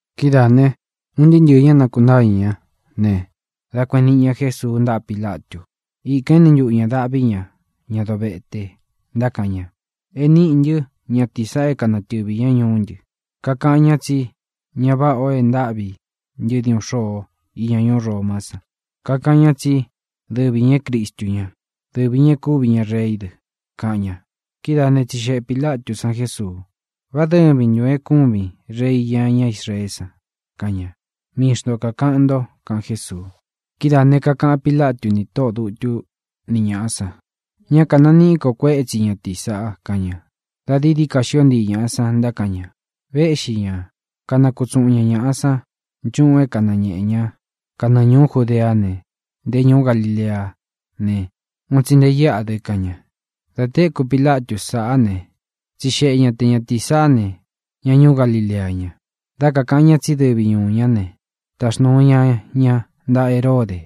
Kidáā ne, un ntɨɨ́ ntɨɨ̄ ñá nakuntáñɨ̄ ñá ne, dā kueꞌen niꞌi ña Jésuu ntáꞌa Pilatu. Ikān éni ntuꞌu ñā daꞌví ña ña dovete, ntákaꞌan ña: —E níꞌī ntɨ́ ñatīi saꞌa é kanatɨvī ñá ñuú ntɨ. Kakaꞌan ñá tsí ña váꞌa ō e ntáꞌvi ntɨ́ diuꞌun xôo íña ñuú Romá san. Kakaꞌan ñá dɨ tsí dɨvi ñā é Cristu ñá, dɨvi ñā é kuvi ña reí dɨ —kaꞌan ña. Kidáa ne, tsixeꞌe Pīlatú san Jesuu: —¿Vá dɨvin ntūn é kūvin Rei iña ñá Israeé san? —kaꞌan ña. —Mii xnto kākaꞌan nto —kaꞌan Jésuu. Kidáā ne, kakaꞌan Pílatu ni tóꞌō dutu ní ñaꞌa san: —Ñá kānaniꞌí ko kuétsi ñatīí saꞌa —kaꞌan ña. Dā dií dií ka xío ntii ñāꞌa san, ntákaꞌan ña: —Véꞌxi ña, kanakutsuꞌun ña ñāꞌa san nchúꞌun é kanañēꞌe ñá kanɨɨ ñūú Judeá ne, nté ñūú Galileá ne, un tsi nte íꞌa dɨ —kaꞌan ña. Dā téku Pilatu sáꞌa ne, tsixeꞌe ña te ñatīí saꞌá ne, ña ñuú Galilea ña. Dá kakāꞌan ña tsí dɨvi ñūu ñá ne, taxnūu ña ña ntaꞌa Heródē,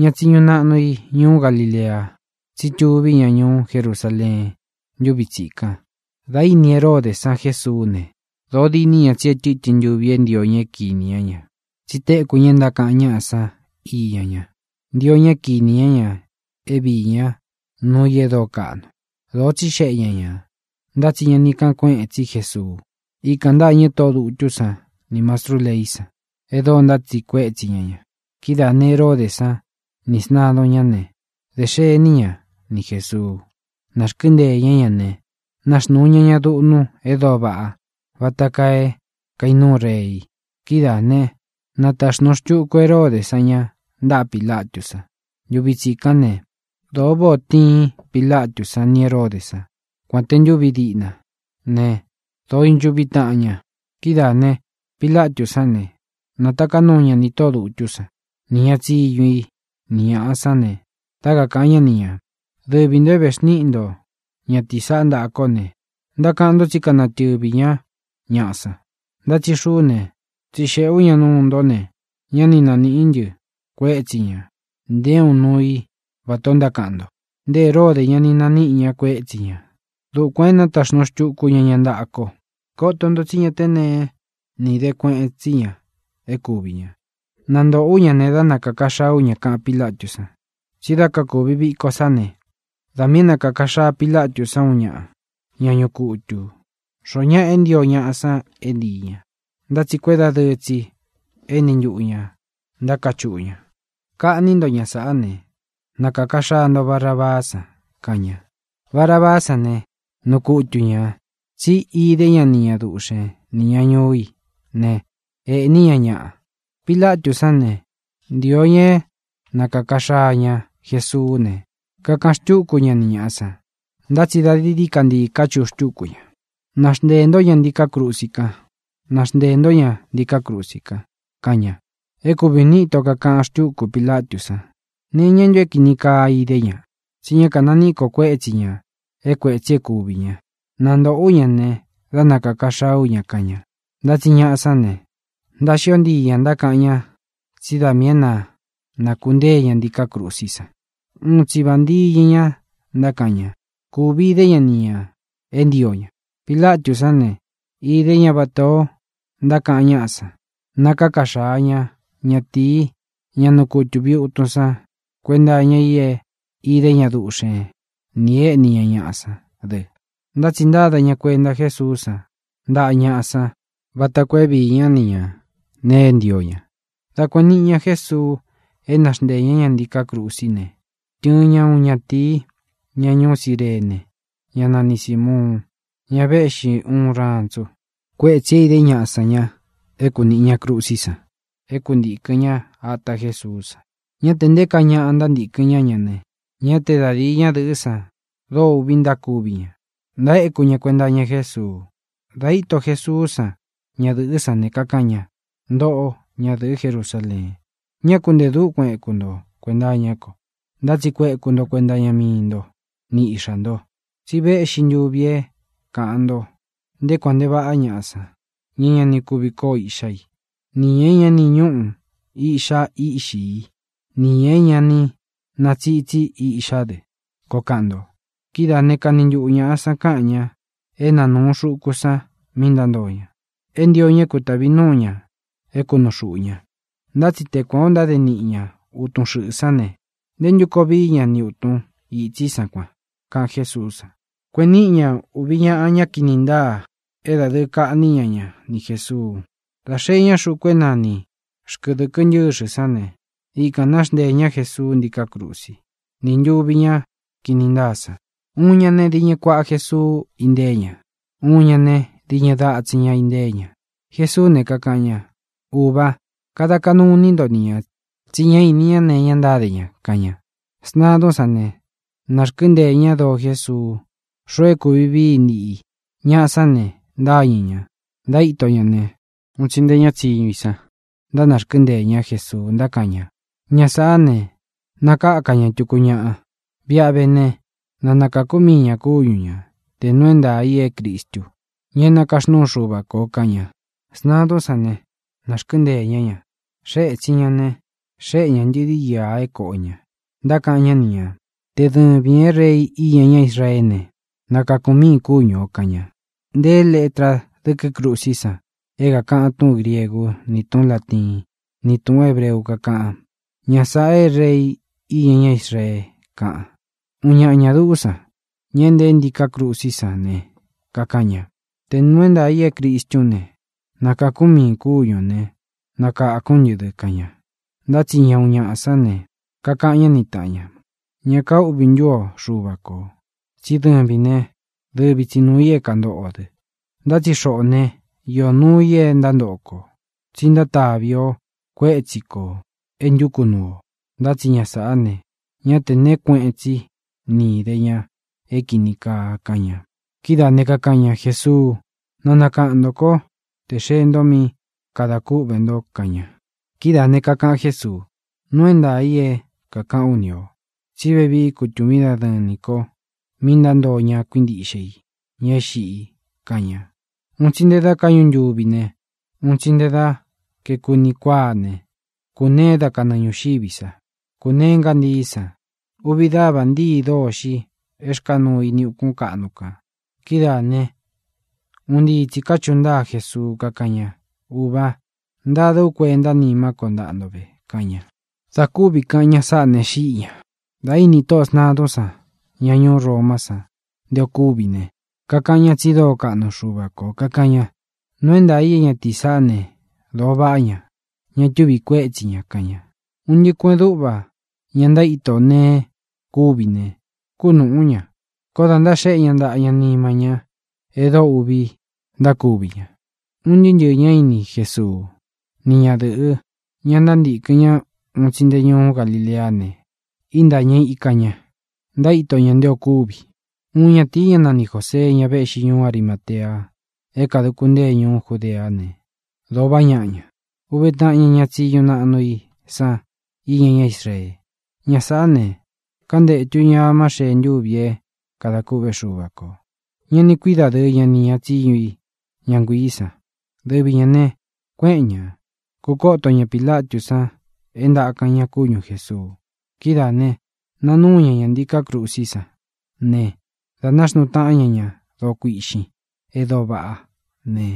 ña tsiñu naꞌnu i ñuú Galilea, tsí tuví ña ñuú Jerusaleen ntúvi tsikan. Dā íni Heródē san Jésuú ne, dōo diní ña tsí e tɨ́tɨn ntuvi é ntio ña é kinī ñá ña, tsi téku ña e ntákaꞌan ñáꞌa san íña ña. Ntio ña é kinī ña é vīí ña nuu i e dóo kaꞌnu. Dōo tsíxeꞌe ña ñā, ntá tsi ña ni káꞌan kueꞌen tsí Jesuu. Ikān ntâñɨ tóꞌō dutú san nī mastrú leí san, e dóo ntátsiꞌi kuetsi ña ña. Kidáā ne, Heródē san ni sntadun ñá ne, dē xení ña ni Jēsuu. Nārkɨ́nteē ñá ña ne, naxnūu ña ña duꞌnu e dóo vaꞌa vata kaa é kainúu rei. Kidáā né, nataxnūu xtuku Heródē san ña ntaꞌa Pilatú san. Ntuvi tsikán ne, dōo váꞌā o tiin Pilatú san ni Hēródē sán, kuān te ntuvi díꞌna ne, dōo ínchuꞌvi taꞌan ña. Kidáā ne, Pilatú san ne, nātaká nuu ña nī tóꞌō dutú san, nī ña tsiñu i, ni ñāꞌa sán ne, dá kakāꞌan ñá ni ñā: —Dɨvi ntō é vēxníꞌi nto ñatīí saꞌá ntaꞌa kó ne, ntákaꞌan nto tsí kanatɨvī ñá ñaꞌa san, ntá tsi xuꞌú ne, tsixeꞌē ú ña nuu ntó ne, ñá ni nanīꞌí ntɨ kuétsi ñā nté uun nuu i vatā o ntákaꞌan nto. Nte Heródē ña ni naníꞌi ña kuétsi ñā. Dukuān é nataxnūu xtuku ña ña ntaꞌa ko. Koto nto tsí ña té neé ni īde kueꞌen tsí ña é kuvī ña. Nantoꞌo ú ña ne, dá nakāka xaa ú ña —kaꞌan Pílatú san. Tsi dá kakūvi viko sá ne, da miī é nakāka xaa Pilatú san uun ñaꞌa, ña ñuꞌu kutu, xoó ñaꞌa é ntio ñaꞌa san é ntīi ña. Ntá tsi kuédadɨɨ tsī éni ntuꞌu ñā ntákachuꞌu ña: —¡Kaꞌní nto ña sāꞌá ne, nakāka xaa nto Barabaá san! —kaꞌan ña. Barabaá san ne, nuu kutu ñā, tsí idé ña duꞌxen nī ña ñuu í ne, ēꞌní ña ñaꞌa. Pilatú san ne, ntīo ña é nakāka xaa ña Jesuú ne, kakaꞌan xtúku ña ni ñāꞌa san. Ntá tsi dií dií ka ntii káchuꞌu xtúku ña: —¡Na xnteē ntó ña ntiká krusi kan! ¡Na xnteē ntó ña ntiká krusi kan! —kaꞌan ña. É kuvi ūni íto kākaꞌan xtúku Pilatú san: —¿Nee iñá ntu é kīni kaa idé ña? Tsí ña kánaniꞌí ko kuétsi ñā é kuētsi é kuvī ña. Nantoꞌo ú ña ne, dá nakāka xaa ú ña —kaꞌan ña. Ntá tsi ñaꞌa sán ne, ntaxío ntii ña ntákaꞌan ña tsí da miī é na nākuntée ña ntīká krusí san. Un tsi vāntiñɨ ña ntákaꞌan ña. Kūvi idé ña niꞌi ña é ntio ña. Pilatú san ne, íde ña vatā o ntákaꞌan ñáꞌa san. Nakáka xaa ña ñatīi, ña nuu kutu viutun san kuenta iña i é idé ña duꞌxen nī e éꞌní ña ñaꞌa sán dɨ, ntá tsi ntāda ña kuenta Jésuú san ntaꞌa ñaꞌa san vata koo é viī ñá ni ñā nee é ntio ña. Dā kueꞌen niꞌi ña Jesuu é na xnteē ñá ña ntiká krusí ne, tɨɨn ña uun ñatīi, ña ñuú Cirene, ñá nani Sīmuun, ñá véꞌxi uun rantsu. Kuétsī é īdé ñaꞌa san ña é kunīꞌi ña krusí san é kuntīkɨn ñá ata Jésuú san. Ñá tē nté kaa ñaꞌa ntántīkɨn ñá ña ne, ñá te da dīi ñádɨ̄ꞌɨ́ san dóo uꞌvi ntákuvi ña, ntaéku ña kuenta iña Jésuu. Dā íto Jesuú san ñadɨ̄ꞌɨ́ san ne, kakaꞌan ña: —Ntoꞌó, ñadɨ̄ꞌɨ́ Jerusaleen, ñá ku ntē dúkuan ēku nto kuenta iñá ko, ntá tsi kueku nto kuenta iña mii nto ni iꞌxá nto. Tsi véꞌxi ntūvi é kāꞌan nto: “Nté kuān nte vaꞌá ñaꞌa san, ña é ña ni kuvi kóo iꞌxá i, nī ña é ña ni ñúꞌu īꞌxá i íꞌxi i, nī ña é ña ni natsitsi íꞌxá dɨ”, koo kaꞌan nto. Kidáā né, kani ntuꞌu ñāꞌa san káꞌan ña é na nūu xuku san mí ntántoo ña, é ntio ña é kutāvi núu ña é kunuu xūꞌu ña. Ntá tsi te kuan ō ntáde niꞌi ña utun xɨꞌɨ̄ sán ne, ¿ntē ntú koo vií ña ni ūtun itsí san kuan? —kaꞌan Jésuú san. Kueꞌen níꞌi ña ūvi ñaꞌa ña kini ntáa é dādɨɨ kaꞌní ña ña ni Jēsuu. Dā xee ñá xuku é nani Xkɨ̄dɨkɨ Ntɨ́xɨ sán ne, ikān náxnteē ñá Jesuu ntíkā krusi, ní ntuvi ñáꞌa ña kini ntáa san: uun ña ne, diñɨ kuaꞌa Jesuu intée ña; uun ña ne, diñɨ datsin ña intée ña. Jesuú ne, kakaꞌan ña: —Ūvá, kada kaꞌnu iní nto ni ñā, tsi ñá ini ñá nee iña ntáde ña —kaꞌan ña. Sntadún san ne, nārkɨ́nteē ñá doo Jésuu xoo é kūvi vií i niꞌi i. Ñaꞌa sán ne, ntáñɨ̄ ña, ntaíto ña ne, un tsi nté ña tsiñu i san ntánarkɨ́nteē ñá Jesuu, ntákaꞌan ña: —Ña sāꞌá ne, nakākú ña tuku ñaꞌa. Viꞌi a vé ne, na nakākú mii ñā kúñu ña, tē nuu é ntaā i é Cristu, ña é nakaxnúu Xuva kō —kaꞌan ña. Sntadún san ne, nārkɨ́nteē ñá ña. Xée ētsin ña ne, xéꞌe ña ntɨ̄di íā é kōꞌo ña. Ntákaꞌan ñá ni ñā: —Te dɨvīn é Rei iña ñá Israeé ne, nakākún miīn kúñu ō —kaꞌan ña. Nteé letra dɨ́kɨ krusí san é kākaꞌan túꞌūn griegú, ni tūꞌún latiín, ni tūꞌún hebreu, kakáꞌan: “Ña sāꞌa é Rei iña ñá Israee”, kaꞌan. Uun ñaꞌa ñā duꞌú san, ña nteé ntiká krusí san ne, kakaꞌan ña: —¡Tē nuu é ntaā i é Cristún ne, nakākún miīn kúñu ō ne, nakākún ntɨ dɨ! —kaꞌan na. Ntá tsi ña uun ñaꞌa sán ne, kakaꞌan ñá ni tāꞌan ña: —¿Ña kaúꞌvī ntú o Xuva kō? Tsí dɨvīn né, dɨvi tsi nūu i kantóꞌo o dɨ. Ntá tsi xoꞌō né, iō nuu i e ntántoꞌo kō, tsi ntantáꞌvi o kuētsí kō e ntúku nuu ō. Ntá tsi ña sāꞌá ne, ñá tē neé kueꞌen tsí ni īde ña é kīni kaa —kaꞌan ña. Kidáā ne, kakaꞌan ña: —Jesuu, na nakaꞌan ntō kó tē xee nto mí kadā kúꞌvē nto —kaꞌan ña. Kidáā ne, kakaꞌan Jésuu: —Nuu é ntaā i é kākaꞌán u ni ō tsí vevií kutūvín dadɨɨn nī ko mí ntántoo ña kuíntiꞌxe i, ña é xiꞌi —kaꞌan ña. Un tsi nte da káꞌñu ntuvi ne, un tsi nte kaeku uni kuáa ne, kūneé da kanɨɨ ñūxiví sa. Kūnee ngántií san. Uvi dávā ntíi dôxi é rkāa nuu ini ukún kaꞌnu kān. Kidáā né, un ntii tsī káchuꞌu ntáa Jesuu, kakáꞌan ña: —¡Ūva, ntada ú kuenta nímá ko ntaꞌa nto ve! —kaꞌan ña. Dā kúvi kāꞌan ña sáꞌa ne, xíꞌi ñā. Dā íni tóꞌō sntadun ñá ñuú Romá san nté ō kúvi ne, kakaꞌan ña tsi dóo kaꞌnu Xuva kō. Kakaꞌan ña: —Nuu é ntaā i é ñatīí saꞌá ne, dōo vaꞌá ña; ña túvi kuētsí ña —kaꞌan ña. Un ntɨꞌɨ kueꞌen dúꞌva ña ntaíto neé kuvi ne, kúnūꞌú ña, koó dā ntaxéꞌe ña ntaꞌa ña nima ñá e dóo uꞌvi ntákuvi ña. Un ntɨɨ́ ntɨ̄ɨ ñá ini Jesuú, ni ñadɨ̄ꞌɨ, ña ntántīkɨn ñá un tsi nte ñúu Galileá ne, intáñɨ ika ñā, ntaíto ña nté ō kúvi. Uun ñatīi, ñá nani Jōsee, ña véꞌxi ñuú Arimatea é kāduku ntée ñuú Judeá ne, dōo vaꞌá ñaꞌa ña. Úvē taꞌan ña ña tsiñu naꞌnu i san iña ñá Israee. Ña sāꞌá ne, kantétu ñā amá xee ntúvi é kadā kûꞌvé Xuva kō. Ñá ni kui dadɨɨ ña ni ña tsiñu i, ña nguiī san. Dɨvi ñā ne, kuéꞌen ña, kūkoto ña Pilatú san é ntākan ña kúñu Jēsuu. Kidáā ne, nanúu ña ña ntīká krusí san ne, dā náxnuu taꞌán ña ña doo kuiꞌxin e dóo vaꞌá ne,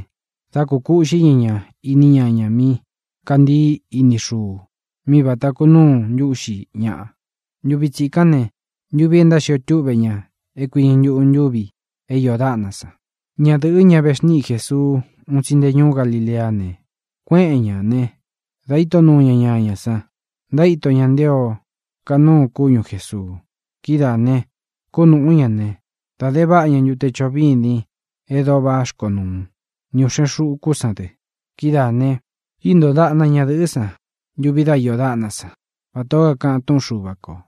dā kukúꞌxi ña ña iní ñañā mí kāntii iní xuu, mí vāta kunuu ntúꞌxi ñaꞌa. Ntuvi tsikán ne, ntuvi e ntáxio túꞌve ña é kuiñɨ ntuꞌu ntúvi é iō dáꞌna san. Ñadɨ̄ꞌɨ́, ña vexníꞌi Jēsuu un tsi nte ñuú Galileá ne, kuéꞌen ñā né, dā íto nuu ña ñañā san, ntaíto ña nté ō kanúu kúñu Jēsuu. Kidáā ne, kúnūꞌú ñā ne, da de váꞌa ña ntute choꞌo vîdin e dóo vá xkonuu, ni ūꞌxen xukú san dɨ. Kidáā ne, íntoo daꞌna ñadɨ̄ꞌɨ́ san ntuvi dá iō dáꞌna san, vatā ó kakaꞌan túꞌun Xuva kō.